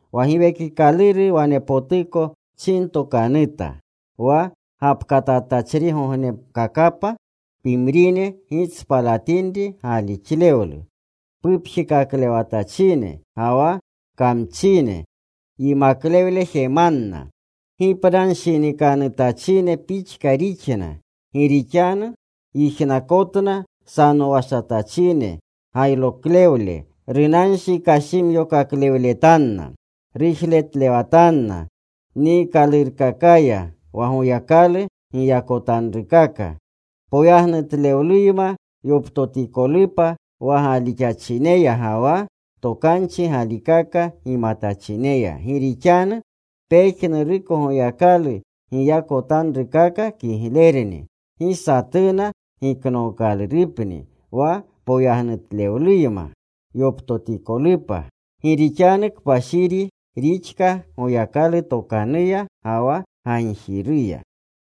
Wa Giwekikaluru wanepotuko chintokanuta, wa gapkatatachrigognekakapa, pimrine gitspalatinri galixlewlu. Pupjekaklewatachine ga wa kamchine yimaklewle jemanna. Gipnanshinikanutachine pixka rixna, gi rixanu yijnakotna sanowashatachine gayroklewle. Runanshi kashimyokaklewletanna. Rujretlewatna niikalurukakaya, wa Goyakalu giyakotanrukaka poyagnutlewluyma yoptotikolupa wa galixachineya ga wa tokanchi galikaka gimatachineya. Gi rixanu pejnuruko Goyakalu giyakotanrukaka kiglerni. Gi satuna giknookalurupni, wa poyagnutlewluyma yoptotikolupa. Gi rixanu kpashiri rixka Goyakalu tokanuya ga wa gagjiruya.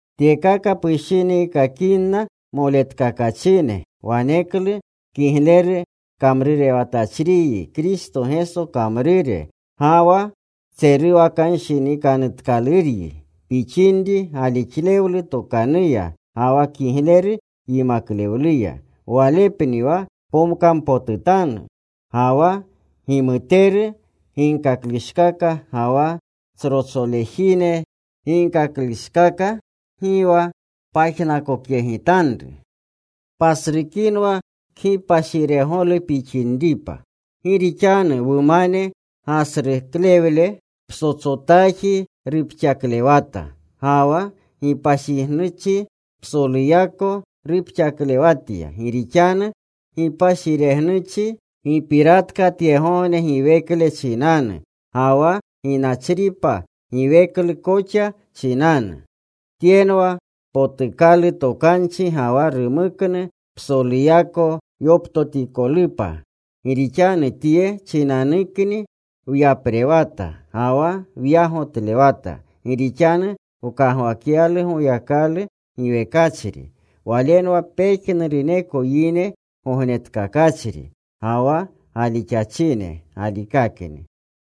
Tyekaka pushiniikakinna moletkakachine, waneklu kigleru kamrurewatachriyi Kristo Geso kamrure. Ga wa tseruwakanshinikanutkaluryi pixinri galixlewlu tokanuya ga wa kigleru yimaklewluya. Walepni wa pomkampotutanru. Ga wa gimuteru ginkaklushkaka ga wa tsrotsolejine ginkakleshkaka, gi wa pajnakokyegitanru. Pasrukinwa kgipashiregolu pixinripa. Gi rixanu wumane gasruklewle psotsotaji rupxaklewata. Ga wa gipashiregnuchi psoluyako rupxaklewatya. Gi rixanu gipashiregnuchi gipiratika tyegogne giwekle chinanu ga wa ginachripa giweklu koxa chinanu. Tyenwa potukalu tokanchi ga wa rumuknu psoluyako yoptotikolupa. Gi rixanu tye chinanukni wyaprewata ga wa wyagotlewata, gi rixanu wkagwakyalu Goyakalu giwekachri. Walenwa pejnuruneko yine Gognetkakachri, ga wa galixachine galikakni.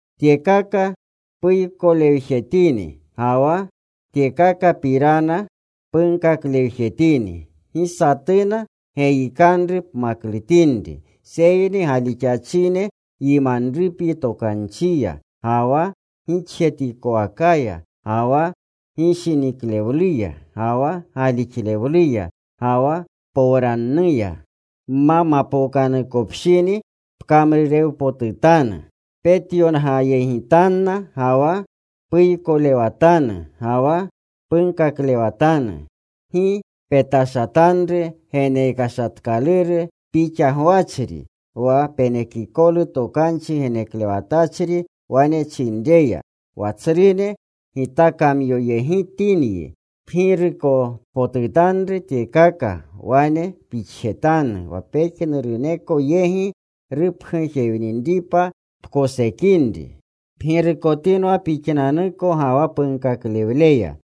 Tyekaka puykolewjetini ga wa tyekakapirana punkaklewjetini. Gi satuna geyikanru pmaklutinri. Seyni galixachine yimanrupyi tokanchiya, ga wa gixjetikowakaya, ga wa gishiniklewluya, ga wa galixlewluya, ga wa powranuya. Nma mapookanukopshini, pkamrurewpotutanu: petyongayegitanna, ga wa puykolewatanu, ga wa punkaklewatanu. Gi petashatanru genekashatkaluru pixa gwachri, wa penekikolu tokanchi geneklewatachri wane chinreya, wa tsrune gitakamyoyegitinyi. Pgirukotpotutanru tyekaka. Wane pixjetanu, wa pejnuruneko yegi rupgujewninripa pkosekinri. Pgirukotinwa pixnanuko ga wa punkaklewleya.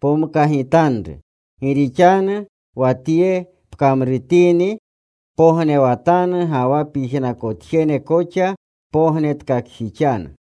Pomkagitanru. Gi rixanu wa tye pkamrutini pognewatanu ga wa pyijnakotjene koxa pognetkakjixanu.